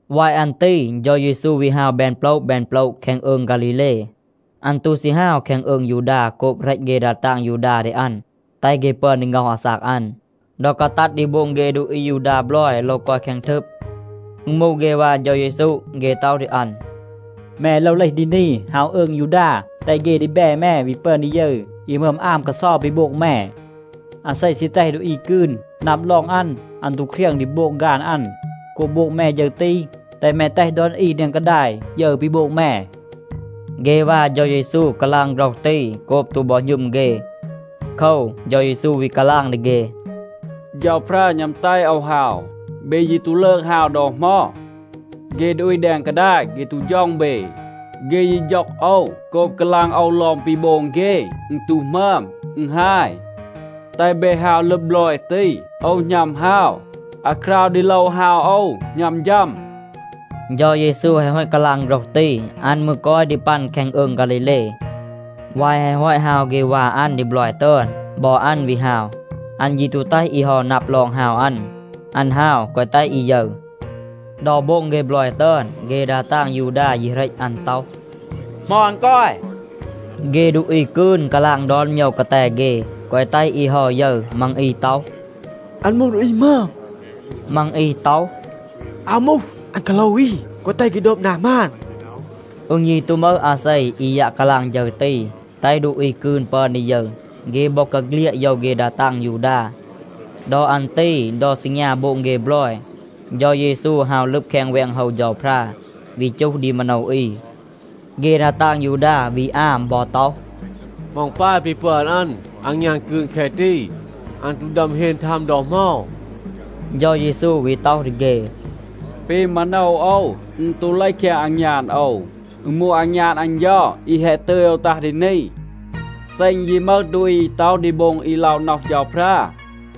วาย อัน ตี เฌา เยซู วี ฮาว แบน โปละ แบน โปละ แคง อืง ฆาลีเล. อัน ตู ซี ฮาว แคง อืง ยูดา โกบ เหรต เฆ ดา ตาง ยูดา ดี อัน, แตห เฆ ปึอน ดี ง็อห อาซาก อัน. ดอ กาตัด ดี โบง เฆ ดูอี อายูดา บลอย โลว กอย แคง ทึบ, อึณ มูห เฆ วา เฌา เยซู เฆ ต็อห ดี อัน, “แม โลว เลห ดี นี, ฮาว อืง ยูดา, แตห เฆ ดีแบ แม วี ปึอน ดี ยึร อี หมึอม อาม กาเซา ปี โบง แม. อาเซ ซี แตห ดูอี กืน นับ ลอง อัน, อัน ตู เครียง ดี โบง ฆาน อัน. โกบ โบง แม ฌึร ตี, แตห แม แตห ดอน อี แดง กาดาย ยึร ปี โบง แม.” เฆ วา เฌา เยซู กาลาง โฆรห ตี โกบ ตู บอ หณึม เฆ. โคว, เฌา เยซู วี กาลาง ดี เฆ, “เฌาพรา หณัม แตห โอว ฮาว. เบ ยี ตู ลืก ฮาว ดอ เหมา. เฆ ดูอี แดง กาดาย เฆ ตู ฌ็อง เบ. เฆ ยี ฌ็อง โอว โกบ กาลาง โอว ลอง ปี โบง เฆ, อึณ ตู หมึอม, อึณ ฮาย. แตห เบ ฮาว ลึบ บลอย ตี. โอว หณัม ฮาว. อาคราว ดี โลว ฮาว โอว หณัม ฌัม.” เฌา เยซู แฮะ ฮอต กาลาง โฆรห ตี, อัน มืร กอย ดี ปัน แคง อืง ฆาลีเล. วาย แฮะ ฮอต ฮาว เฆ วา อัน ดี บลอย ตึอน, บอ อัน วี ฮาว. อัน ยี ตู แตห อี เฮา นับ ลอง ฮาว อัน. อัน ฮาว, แกวะ แตห อี ยึร. ดอ โบง เฆ บลอย ตึอน, เฆ ดา ตาง ยูดา ยี เหรต อัน ต็อห, “เหมา อัน กอย?” เฆ ดูอี กืน กาลาง ดอน โมยว กาแต เฆ, แกวะ แตห อี เฮา ยึร. มัง อี ต็อห, “อัน มูห ดูอี หมึอม.” มัง อี ต็อห, “อาว มูห. อัน กาโลว อี, แกวะ แตห เฆ โดบ นา หมาน.” อึณ ยี ตู มึห อาเซ, อี ยัะ กาลาง ฌึร ตี, แตห ดูอี กืน ปึอน ดี ยึร. เฆ บอกาเฆลียด โยว เฆ ดา ตาง ยูดา. ดอ อัน ตี ดอ ซีงยา โบง เฆ บลอย, เฌา เยซู ฮาว ลึบ แคง แวง โฮว เฌาพรา, วี จูห ดี มาโนว อี. เฆ ดา ตาง ยูดา วี อาม บอ ต็อห, “เหมา อึณ ปาย ปี ปึอน อัน อางยาน กืน แคะ ตี? อัน ตู ดึอม เฮน ทัม ดอ เหมา.” เฌา เยซู วี ต็อห ดี เฆ, “ปี มาโนว โอว, อึณ ตู เลห แคง อางยาน โอว. อึณ มูห อางยาน อัน เฌา อี แฮะ ตึย โอว ตัห ดี นี. เซ อึณ ยี มึห ดูอี อี ต็อห ดี โบง อี ล็อะ น็อห เฌาพรา,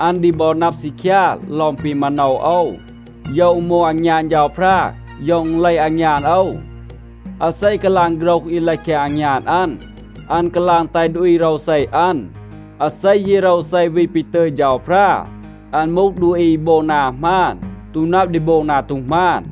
อัน ดี บอ นับ ซีคยา ลอง ปี มาโนว โอว, โยว อึณ มูห อางยาน เฌาพรา, โยว อึณ เลห อางยาน โอว. อาเซ กาลาง โฆรห อี เลห แคง อางยาน อัน, อัน กาลาง แตห ดูอี โรวเซ อัน. อาเซ ยี โรวเซ วี ปี ตึย เฌาพรา, อัน มูห ดูอี อี โบง นา หมาน, ตู นับ ดี โบง นา ตู หมาน.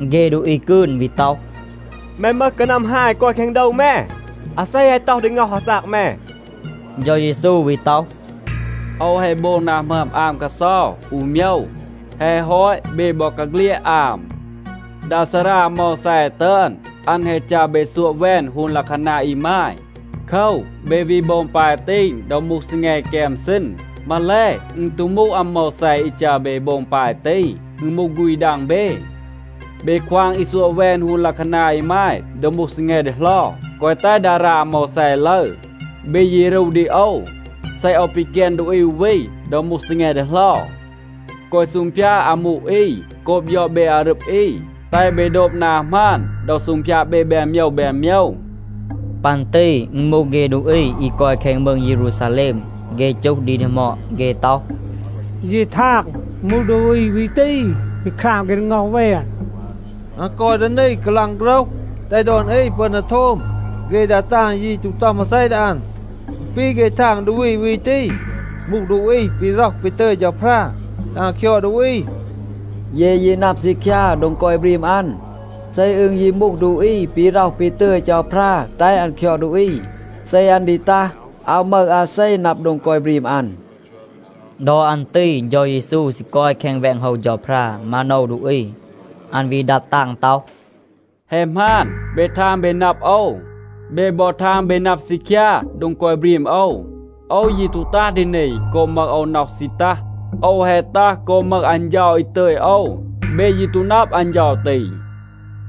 เฆ ดูอี กืน วี ต็อห, “แม มึห กานัม ฮาย กอย แคง โดว แม. อาเซ แฮะ ต็อห ดี ง็อห อาซาก แม?” เฌา เยซู วี ต็อห, “โอว แฮะ โบง นา หมึอม อาม กาเซา อู โมยว. แฮะ ฮอต, เบ บอกาเฆลียด อาม. ดา ซารา อาโมวแซ ตึอน, อัน แฮะ จัร เบ ซัวะ แวน ฮูน ลัะคานา อีมาย. โคว, เบ วี โบง ปาย ตี ดอ มูห ซีแง แกม ซีณ. (มาแล อึณ ตู มูห อาโมวแซ อี จัร เบ โบง ปาย ตี. อึณ มูห ฆูณ ดัง เบ). เบ ควาง อี ซัวะ แวน ฮูน ลัะคานา อีมาย ดอ มูห ซีแง ดีเหลา, แกวะ แตห ดารา อาโมวแซ ลึร. เบ ยี รู ดี โอว, เซ โอว ปีแกน ดูอี อู วี ดอ มูห ซีแง ดีเหลา. แกวะ ซูงพยาด อามู อี โกบ ยอด เบ อารึบ อี. แตห เบ โดบ นา หมาน ดอ ซูงพยาด เบ แบน โมยว แบน โมยว.” ปัน ตี อึณ มูห เฆ ดูอี อี กอย แคง มืง เยรูซาแลม. เฆ จูห ดี ดีหมอด. เฆ ต็อห, “เย ทาง, อึณ มูห ดูอี วี ตี, ปี คราม เฆ ดี ง็อห แวน. อัน กอย ดี นี, กาลาง โฆรห, แตห ดอน อี ปึอน ดี โทม. เฆ ดา ตาง ยี ตู ต็อห มาเซ ดี อัน. อึณ ปี, เฆ ทาง ดูอี วี ตี มูห ดูอี ปี ร็อห ปี ตึย เฌาพรา แตห อัน คยอด ดูอี. เย ยี นับ ซีคยา โดง กอย บรีม อัน. เซ อึณ ยี มูห ดูอี ปี ร็อห ปี ตึย เฌาพรา แตห อัน คยอด ดูอี, เซ อัน ดี ตัห, อาว มึห อาเซ นับ โดง กอย บรีม อัน.” ดอ อัน ตี เฌา เยซู ซี กอย แคง แวง โฮว เฌาพรา, มาโนว ดูอี. อัน วี ดัด ตาง ต็อห, “แฮะ หมาน, เบ ทาง เบ นับ โอว. เบ บอ ทาง เบ นับ ซีคยา โดง กอย บรีม โอว. โอว ยี ตู ตัห ดี นี โกบ มึห โอว น็อห ซี ตัห. โอว แฮะ ตัห โกบ มึห อัน เฌา อี ตึย โอว. เบ ยี ตู นับ อัน เฌา ตี.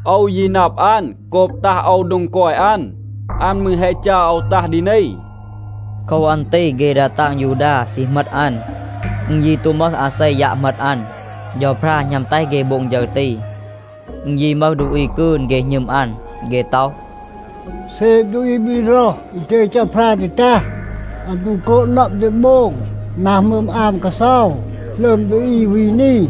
โอว ยี นับ อัน โกบ ตัห โอว โดง กอย อัน, อัน มืร แฮะ จัร โอว ตัห ดี นี.” โคว อัน ตี เฆ ดา ตาง ยูดา ซี เหมต อัน. อึณ ยี ตู มึห อาเซ ยัะ เหมต อัน. เฌาพรา หณัม แตห เฆ โบง ฌึร ตี. อึณ ยี มึห ดูอี กืน, เฆ หณึม อัน. เฆ ต็อห, “เซ ดูอี ปี ร็อห ปี ตึย เฌาพรา ดี ตัห, อัน ตู โกบ นับ ดี โบง นา หมึอม อาม กาเซา หลึอม ดูอี วี นี.”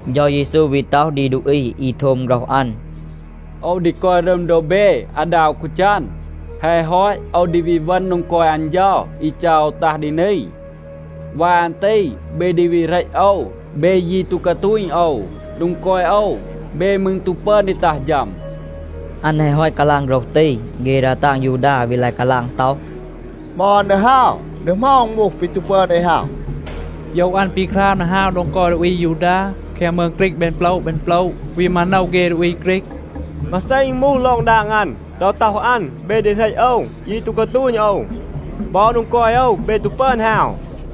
เฌา เยซู วี ต็อห ดี ดูอี อี โทม โฆรห อัน, “โอว ดี กอย รึม โดบ เบ อาดา อู กาจัน. แฮะ ฮอต โอว ดี วี เวณ โดง กอย อัน เฌา อี จัร โอว ตัห ดี นี. วาย อัน ตี เบ ดี วี เหรต โอว. เบ ยี ตู กาตูณ โอว. โดง กอย โอว, เบ มืร ตู ปึอน ดี ตัห ฌัม.” อัน แฮะ ฮอต กาลาง โฆรห ตี, เฆ ดา ตาง ยูดา วี ลาย กาลาง ต็อห, “เหมา อัน ดี ฮาว? ดี เหมา อึณ มูห, ปี ตู ปึอน เอ ฮาว. โยว อัน ปี คราม ดี ฮาว โดง กอย ดูอี อายูดา แคง มืง ฆรีก แบน โปละ แบน โปละ, วี มาโนว เฆ ดูอี ฆรีก. มาเซ อึณ มูห ลอง ดาง อัน, ดอ ต็อห อัน, ‘เบ ดี เหรต โอว, ยี ตู กาตูณ โอว.’ บอ, ‘โดง กอย โอว เบ ตู ปึอน ฮาว.’”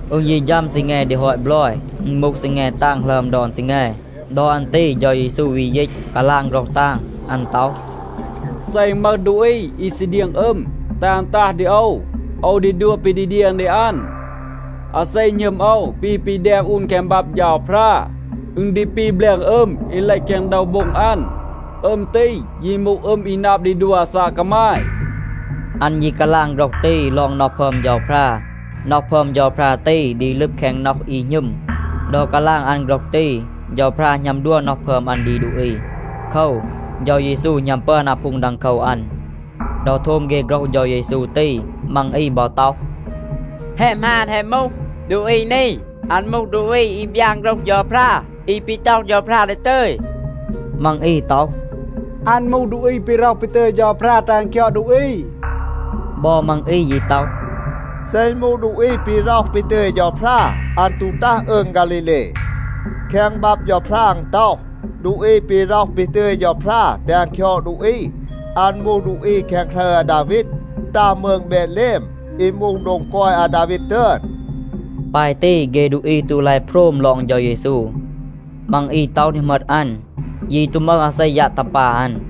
อึณ ยี ฌัม ซีแง ดี ฮอต บลอย. อึณ มูห ซีแง ตาง หลึอม ดอน ซีแง. ดอ อัน ตี เฌา เยซู วี ยีต, กาลาง โฆรห ตาง. อัน ต็อห, “เซ อึณ มึห ดูอี อี ซี เดียง อึม, แตห อัน ตัห ดี โอว. โอว ดี ดัว ปี ดี เดียง ดี อัน. อาเซ หณึม โอว ปี ปี แดม อูน แคง บับ เฌาพรา, อึณ ดี ปี แบลง อึม อี เลห แคง โดว โบ็ง อัน. อึม ตี ยี มูห อึม อี นับ ดี ดัว อาซาก กามาย.” อัน ยี กาลาง โฆรห ตี ลอง น็อห พึอม เฌาพรา. น็อห พึอม เฌาพรา ตี ดี ลึบ แคง น็อห อี หณึม. ดอ กาลาง อัน โฆรห ตี, เฌาพรา หณัม ดัว น็อห พึอม อัน ดี ดูอี. โคว, เฌา เยซู หณัม ปึอน อาพูง ดังโคว อัน. ดอ โทม เฆ โฆรห เฌา เยซู ตี, มัง อี บอ ต็อห, “แฮะ หมาน, แฮะ มูห. ดูอี นี, อัน มูห ดูอี อี บยาน โฆรห เฌาพรา, อี ปี ต็อห เฌาพรา ดี ตึย.” มัง อี ต็อห, “อัน มูห ดูอี ปี ร็อห ปี ตึย เฌาพรา แตห อัน คยอด ดูอี.” บอ มัง อี ยี ต็อห, “เซ อึณ มูห ดูอี ปี ร็อห ปี ตึย เฌาพรา, อัน ตู ตัห อืง ฆาลีเล. แคง บับ เฌาพรา อึณ ต็อห, ดูอี ปี ร็อห ปี ตึย เฌาพรา แตห อัน คยอด ดูอี, อัน มูห ดูอี แคง ครึร อาดาวีด, ตัห มืง เบดแลม อี มูห โดง กอย อาดาวีด ตึอน.” ปาย ตี, เฆ ดูอี ตู ลาย โพรม ลอง เฌา เยซู. มัง อี ต็อห ดี เหมต อัน. ยี ตู มึห อาเซ, ยัะ ตัห ปา อัน.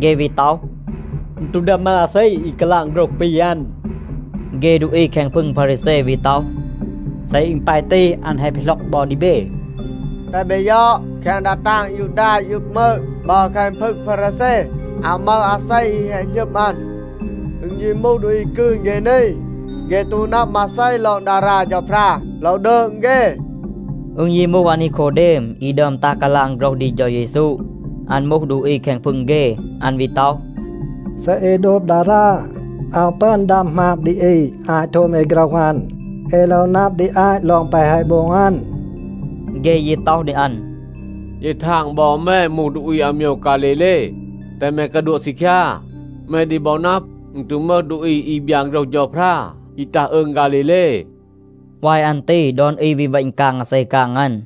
เฆ วี ต็อห, “อึณ ตู ดึอม มึห อาเซ, อี กาลาง โฆรห ปี อัน.” เฆ ดูอี แคง พึง พารีแซ วี ต็อห, “เซ อึณ ปาย ตี, อัน แฮะ ปีหล็อก บอ ดี เบ. แตห เบ ยอด, แคง ดา ตาง ยูดา อี อึบ มืง บอ แคง พึง พารีแซ อาว มึห อาเซ อี แฮะ หณึม อัน. อึณ ยี มูห ดูอี กืน เฆ นี, เฆ ตู นับ มาเซ ลอง ดารา เฌาพรา, โลว ดืง เฆ.” อึณ ยี มูห อานีโคเดม, อี ดึอม ตัห กาลาง โฆรห ดี เฌา เยซู. อัน มูห ดูอี แคง พึง เฆ. อัน วี ต็อห, “เซ เอ โดบ ดารา, อาว ปึอน ดัม หมาบ ดี อี อาต โทม เอ โฆรห อัน. เอ โลว นับ ดี อาต ลอง แปะ แฮะ โบง อัน.” เฆ ยี ต็อห ดี อัน, “เย ทาง บอ แม มูห ดูอี อาโมยว ฆาลีเล. แตห แม กาดัวะ ซีคยา. แม ดี บอ นับ, อึณ ตู มึห ดูอี อี บยาน โฆรห เฌาพรา, อี ตัห อืง ฆาลีเล.” วาย อัน ตี ดอน อี วี เวณ กาง อาเซ กาง อัน.